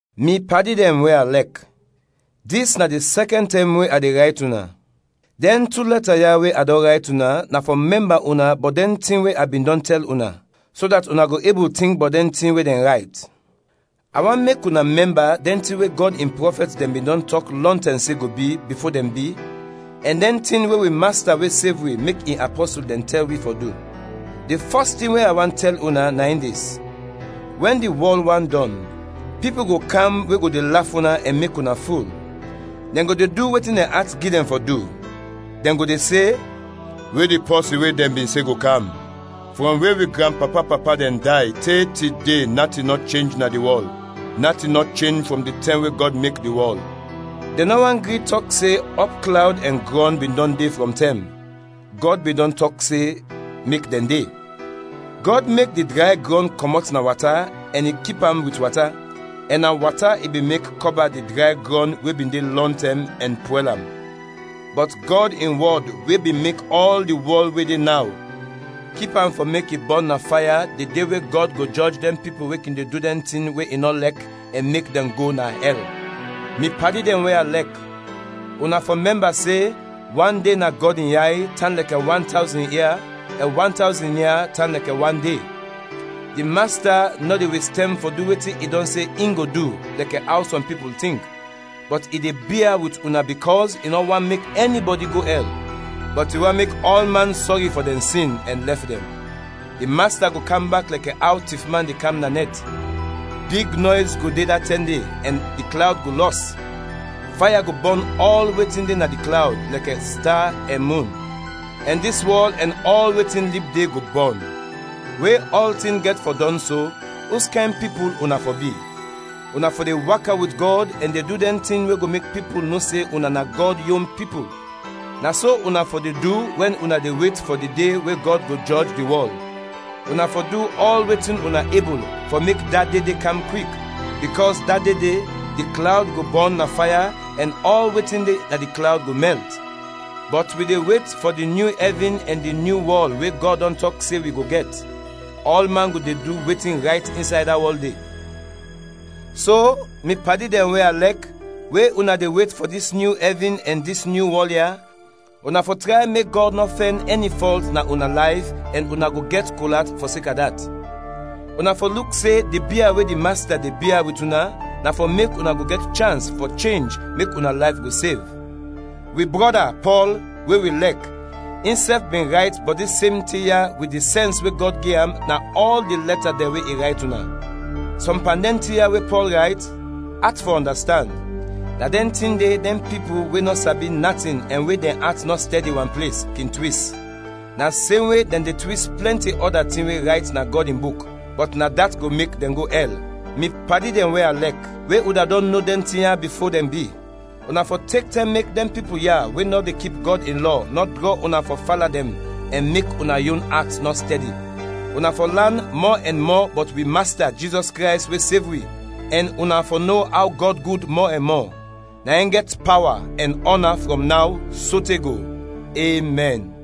Mi padi dɛn we a lɛk, dis na di sɛkɛn tɛm we a de rayt una. Dɛn tu lɛta ya we a dɔn rayt una na fɔ mɛmba una bɔt dɛn tin we a bin dɔn tɛl una, so dat una go ebul tink bɔt dɛn tin we dɛn rayt. A want mek una mɛmba dɛn tin we Gɔd in prɔfɛt dɛn bin dɔn tɔk lɔntɛm se go bi, bifo dɛn bi, ɛn dɛn tin we wi Masta we sev wi mek in apɔsul dɛn tɛl wi fɔ du. Di fɔs tin we a want tɛl una na in dis: wɛn di wɔl want dɔn, pipul go kam we go de laf una ɛn mek una ful. Dɛn go de du wetin dɛn at gi dɛn fɔ du. Dɛn go de se, “We di pɔsin we dɛn bin se go kam? Frɔm we wi granpapa-papa dɛn day te tide natin nɔ chenj na di wɔl; natin nɔ chenj frɔm di tɛm we Gɔd mek di wɔl!” Dɛn nɔ want gri tɔk se ɔpklawd ɛn grɔn bin dɔn de frɔm tɛm; Gɔd bin dɔn tɔk se mek dɛn de. Gɔd mek di dray grɔn kɔmɔt na wata ɛn i kip am wit wata, ɛn na wata i bin mek kɔba di dray grɔn we bin de lɔntɛm ɛn pwɛl am. Bɔt Gɔd in wɔd we bin mek ɔl di wɔl we de naw, kip am fɔ mek i bɔn na faya di de we Gɔd go jɔj dɛn pipul we kin de du dɛn tin we i nɔ lɛk ɛn mek dɛn go na ɛl. Mi padi dɛn we a lɛk, una fɔ mɛmba se, wan de, na Gɔd in yay, tan lɛkɛ wan tawzin ia ɛn wan tawzin ia tan lɛkɛ wan de. Di Masta nɔ de wes tɛm fɔ du wetin i dɔn se in go du, lɛkɛ aw sɔm pipul tink, bɔt i de bia wit una bikɔs i nɔ want mek ɛnibɔdi go ɛl, bɔt i want mek ɔlman sɔri fɔ dɛn sin ɛn lɛf dɛn. Di Masta go kam bak lɛkɛ aw tifman de kam na nɛt. Big nɔys go de da tɛm de ɛn di klawd go lɔs; faya go bɔn ɔl wetin de na di klawd lɛkɛ sta ɛn mun; ɛn dis wɔl ɛn ɔl wetin lib de, go bɔn. We ɔltin gɛt fɔ dɔn so, uskayn pipul una fɔ bi? Una fɔ de waka wit Gɔd ɛn du dɛn tin we go mek pipul no se una na Gɔd yon pipul; na so una fɔ de du wɛn una de wet fɔ di de we Gɔd go jɔj di wɔl, una fɔ du ɔl wetin una ebul fɔ mek da de de kam kwik, bikɔs da de de, di klawd go bɔn na faya ɛn ɔl wetin de na di klawd go mɛlt. Bɔt wi de wet fɔ di nyu ɛvin ɛn di nyu wɔl we Gɔd dɔn tɔk se wi go gɛt; ɔlman go de du wetin rayt insay da wɔl de. So, mi padi dɛn we a lɛk, we una de wet fɔ dis nyu ɛvin ɛn dis nyu wɔl ya, una fɔ tray mek Gɔd nɔ fɛn ɛni fɔlt na una layf ɛn una go gɛt kol at fɔseka dat. Una fɔ luk se di bia we di Masta de bia wit una na fɔ mek una go gɛt chans fɔ chenj mek una layf go sev. Wi brɔda Pɔl, we wi lɛk, insɛf bin rayt bɔt dis sem tin ya wit di sɛns we Gɔd gi am, na ɔl di lɛta dɛn we i rayt una. Sɔm pan dɛn tin ya we Pɔl rayt, at fɔ ɔndastand, na dɛn tin de dɛn pipul we nɔ sabi natin ɛn we dɛn at nɔ stɛdi wan ples, kin twis. Na semwe dɛn de twis plɛnti ɔda tin we rayt na Gɔd in Buk, bɔt na dat go mek dɛn go ɛl. Mi padi dɛn we a lɛk, we una dɔn no dɛn tin ya bifo dɛn bi, una fɔ tek tɛm mek dɛn pipul ya we nɔ de kip Gɔd in lɔ nɔ drɔ una fɔ fala dɛn ɛn mek una yon at nɔ stɛdi. Una fɔ lan mɔ ɛn mɔ bɔt wi Masta Jizɔs Krays we sev wi, ɛn una fɔ no aw Gɔd gud mɔ ɛn mɔ. Na in gɛt pawa ɛn ɔna frɔm naw sote go! Emɛn.